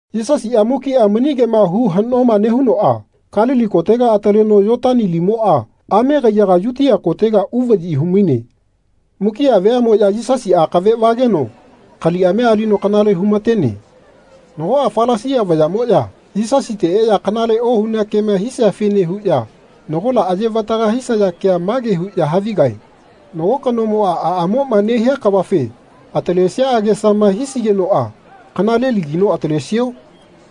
Yisasiꞌa mukiꞌa mani kema hu haꞌnoma nehunoꞌa Kalili kotega ataleno Yotani limoꞌa ame kaiyaga Yutia kotega uvaꞌyi hu-maine. Mukiꞌa veaꞌmoꞌya Yisasi akave vageno kaliꞌamia alino kanale hu-ma-tene. Nagoꞌa Falasia vayaꞌmoꞌya Yisasite eꞌya kanale ohunea kema hisiafene huꞌya nagola aye-vataga hisaya kea mage huꞌya havigae “Nago kanomoꞌa aꞌamoꞌma nehia kavafe atalesia agesama hisigenoꞌa kanalelagino atalesio?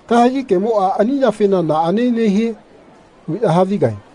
Kahegi kemoꞌa ani yafena naꞌane nehie?” huꞌya havigae.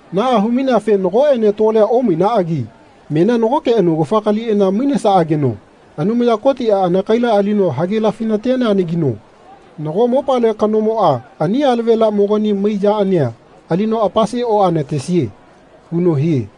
Naꞌa hu-maineafe nagoꞌene tolea omainaꞌagi menia nagoke anagufa kaliꞌana mainesaꞌageno Anumaya Kotiꞌa anakaila alino hagelafi-na-teneanageno nago mopale kanomoꞌa ani alavelamogani mai yaꞌania alino apase oꞌana-tesie.” huno hie.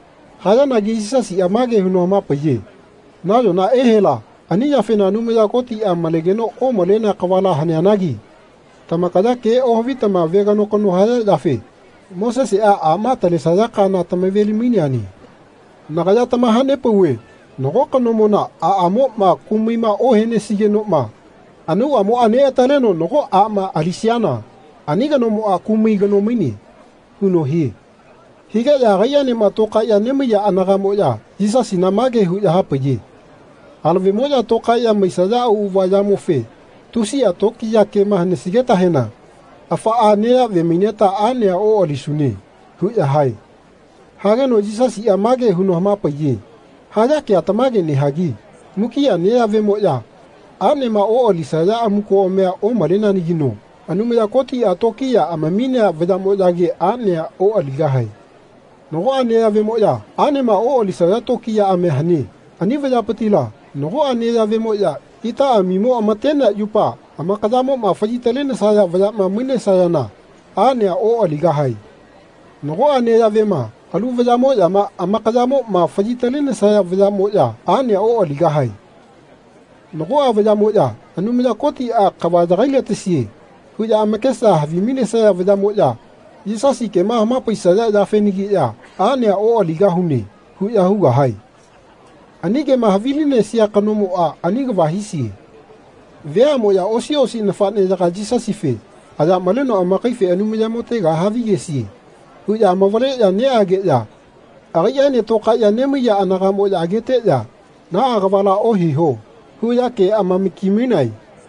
Hayanagi Yisasiꞌa mage huno hama-paiye “Nayona ehela ani yafena Anumaya Kotiꞌa malegeno omalenea kavala haneanagi tamakaya ke ohavitama veganokano haya yafe Moseseꞌa aꞌma atalesaya kaana tama-ve-li-maineane. Nagaya tamaha-nepauve nago kanomona aꞌamoꞌma kumaima ohenesigenoꞌma anauꞌamoꞌa neꞌataleno nago aꞌma alisiana ani kanomoꞌa kumai kano maine.” huno hie. Higeꞌya agaiꞌaenema tokaeꞌya nemaiya anagaꞌmoꞌya Yisasina mage huꞌya hapaiye “Alavemoꞌya tokaeꞌya maisaya auꞌava yamofe tusiꞌa tokiya kema hanesigetahena afaꞌa neyaꞌve maineta aꞌnea oꞌalisune.” huꞌya hae. Hageno Yisasiꞌa mage huno hama-paiye “Haya kea tamage nehagi mukiꞌa neyaꞌvemoꞌya aꞌnema oꞌalisaya amukoꞌamia omaleneanagino Anumaya Kotiꞌa tokiya amaminea vayaꞌmoꞌyage aꞌnea oꞌaligahae. Nagoꞌa neyaꞌvemoꞌya aꞌnema oꞌalisaya tokiyaꞌamia hane. Ani vayapitila nagoꞌa neyaꞌvemoꞌya itaꞌaꞌmimo ama-tenea yupa amakayamoꞌma faꞌyi-talenesaya vayaꞌma mainesayana aꞌnea oꞌaligahae. Nagoꞌa neyaꞌvema alu vayaꞌmoꞌyama amakayamoꞌma faꞌyi-talenesaya vayaꞌmoꞌya aꞌnea oꞌaligahae. Nagoꞌa vayaꞌmoꞌya ‘Anumaya Kotiꞌa kava yagai-la-tesie.’ huꞌya amakesa havi-mainesaya vayaꞌmoꞌya Yisasi kema hama-paisaya yafenagiꞌya ‘Aꞌnea oꞌaligahune.’ huꞌya hugahae. Ani kema havilinesia kanomoꞌa ani kava hisie.” Veaꞌmoꞌya osi osi nafaꞌneyaga Yisasife “Aya maleno amakaife Anumayamotega havigesie.” huꞌya amavaleꞌya neꞌageꞌya agaiꞌaene tokaeꞌya nemaiya anagamoꞌya ageteꞌya “Naꞌa kavala ohiho.” huꞌya ke-amaki-mainae.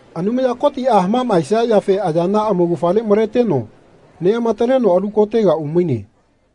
Anumaya Kotiꞌa hamaꞌmaesia yafe ayana amaugafale maleteno neꞌamataleno alu kotega umaine.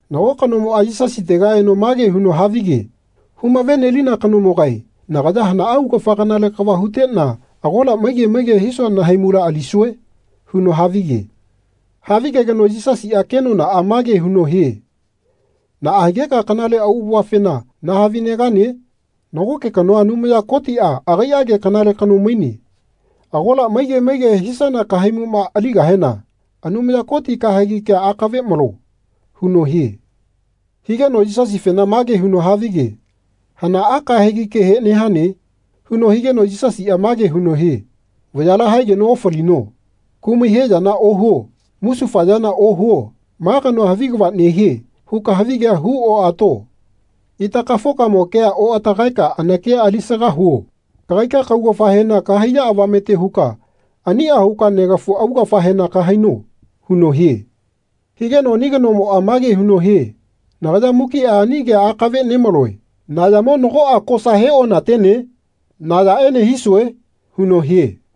Nago kanomoꞌa Yisasiteka eno mage huno havige “Hu-mave-nelina kanomogae nagaya hana augafa kanale kava huteꞌna agola maige maige hisua nahaimula alisue?” huno havige. Havigegeno Yisasiꞌa kenonaꞌa mage huno hie “Naꞌa higeka kanale auꞌavafena nahavi-negane? Nagoke kanoa Anumaya Kotiꞌa agaiꞌage kanale kano maine. Agola maige maige hisana kahaimuꞌma alinukahena Anumaya Koti kahegi kea akave malo.” huno hie. Higeno Yisasifena mage huno havige “Hanaꞌa kahegi kehe nehane?” huno higeno Yisasiꞌa mage huno hie “Vayala haegeno ofalino. Kumai he yana ohuo. Musufayana ohuo. ‘Ma kanoa havi kava nehie.’ huka havigea hu-oꞌato. Itakafokamo kea oꞌatagaeka anakia alisaga huo. Kagaika kaugafahena kahaiya avamete huka aniꞌa huka negafu augafahena kahaino.” huno hie. Higeno ani kanomoꞌa mage huno hie “Nagaya mukiꞌa ani kea akave nemaloe. Na yamo nagoꞌa kosa he-ona-tene? Na yaꞌene hisue?” huno hie.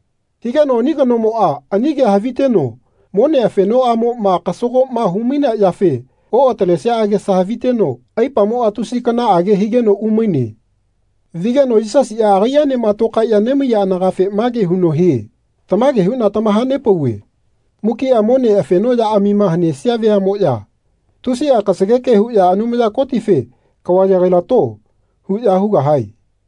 Higeno ani kanomoꞌa ani kea haviteno mone afenomaꞌamoꞌma kasagoꞌma hu-mainea yafe oꞌatalesia agesa haviteno aipamoꞌa tusi kanaꞌage higeno umaine. Vigeno Yisasiꞌa agaiꞌaenema tokaeꞌya nemaiya anagafe mage huno hie “Tamage huꞌna tamaha-nepauve mukiꞌa mone afenoꞌyaꞌamima hanesia veaꞌmoꞌya tusiꞌa kasageke huꞌya Anumaya Kotife ‘Kava yagai-lato.’ huꞌya hugahae.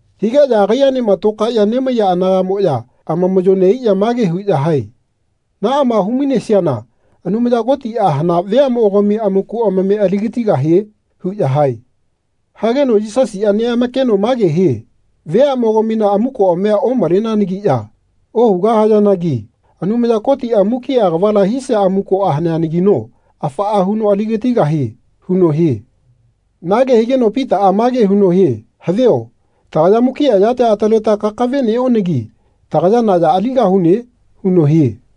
Higeꞌya agaiꞌaenema tokaeꞌya nemaiya anagaꞌmoꞌya amamaꞌyo neꞌaiꞌya mage huꞌya hae “Naꞌama hu-mainesiana Anumaya Kotiꞌa hana veaꞌmogami amaku amame ali-gatigahie?” huꞌya hae. Hageno Yisasiꞌa neꞌamakeno mage hie “Veaꞌmogamina amukoꞌamia omaleneanagiꞌya ohugahayanagi Anumaya Kotiꞌa mukiꞌa kavala hisia amukoꞌa haneanagino afaꞌa huno ali-gatigahie.” huno hie. Nage higeno Pitaꞌa mage huno hie “Havio tagaya mukiꞌa yatia ataleteta kakave neꞌonagi tagaya na ya aligahune?” huno hie.